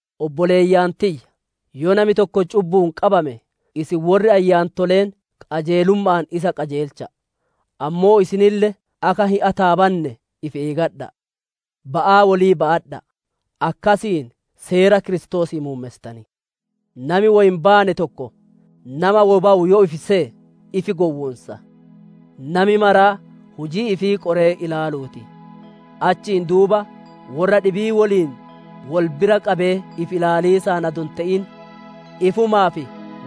Obboleeyyan tiyya, yoo nami tokko cubbu'uun qabame, isin worri ayyaantoleen qajeelumma'aan isa qajeelcha'a! Ammoo isinille akka hin ataabanne ifi eeggadha'a. Ba'aa wolii ba'adha'a! Akkasiin Seera Kiristoosii muummessitan. Nami woy hin baane tokko, nama woy bawu yoo ifi seye, ifi gowwoonsa. Nami maraa hujii ifii qoree ilaaluu ti! Achiin duuba worra dhibii woliin wol bira qabee ifi ilaaliisaan adoo hin te'in, ifumaaf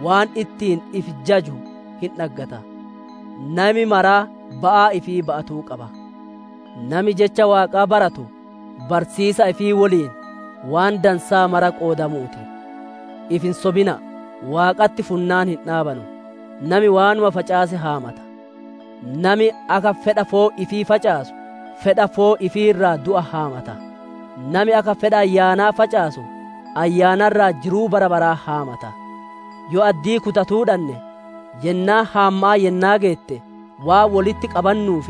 waan ittiin ifi jaju hin dhaggata. Nami maraa ba'aa ifii ba'atuu qaba. Nami Jecha Waaqaa baratu, barsiisaa ifii woliin waan dansaa mara qoodamuu ti! Ifi hin sobina'a! Waaqatti funnaan hin dhaabanu. Nami waanuma facaase haammata. Nami akka fedha foon ifii facaasu, fedha foon ifii irraa du'a haammata; nami akka fedha Ayyaanaa facaasu, Ayyaana irraa jiruu bara baraa haammata. Yoo addii kutatuu dhanne, yennaan haamma'aa yennaa geette, waan wolitti qabannuuf,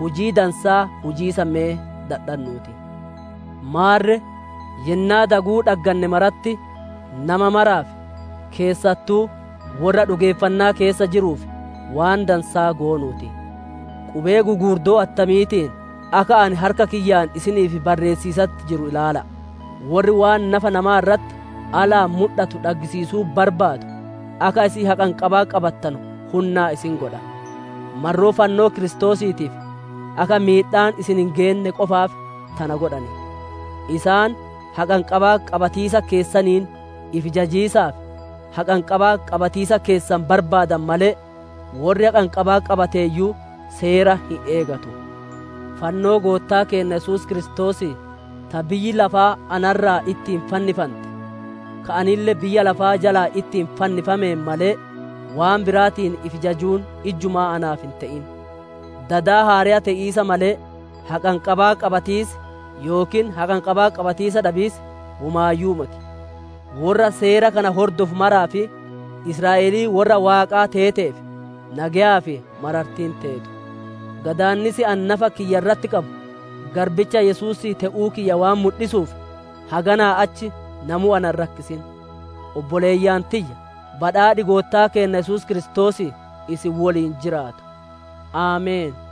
hujii dansaa hujiisa me dadhannuu ti. Maarre yennaa daguu dhagganne maratti, nama maraaf, keessattuu worra dhugeeffannaa keessa jiruuf, waan dansaa goonuu ti. Qubee gugurdoo attamiitiin akka ani harka kiyyaan isiniif barreessiisatti jiru ilaala'a! Worri waan nafa namaa irratti alaan mudhatu dhaggisiisuu barbaadu, akka isin haqanqabaa qabattanu hunnaan isin godha. Marroo fannoo Kiristoosiitiif, akka miidhaan isaan hin geenne qofaaf tana godhan. Isaan haqanqabaa qabatiisa keessaniin ifi jajiisaaf, haqanqabaa qabatiisa keessan barbaadan malee, worri haqanqabaa qabateeyyuu Seera hin eegatu. Fannoo Goottaa Keenna Yesuus Kiristoosii, ta biyyi lafaa ana irraa ittiin fannifante, ka anille biyya lafaa jalaa ittiin fannifameen malee, waan biraatiin ifi jajuun ijjumaa naaf hin te'in. Dada haareya te'iisa malee, haqanqabaa qabatiisii, yookiin haqanqabaa qabatiisa dhabiisi womaayyuu moti. Worra seera kana hordofu maraa fi Israa'elii worra Waaqaa teeteef, nageyaa fi marartiin teetu. Gadaannis ani nafa kiyya irratti qabu, garbicha Yesuusii te'uu kiyya waan mudhisuuf, haganaa achi namuu na hin rakkisin. Obboleeyyan tiyya, badhaadhi Goottaa keenna Yesuus Kiristoosii isin woliin jiraatu. Ameen.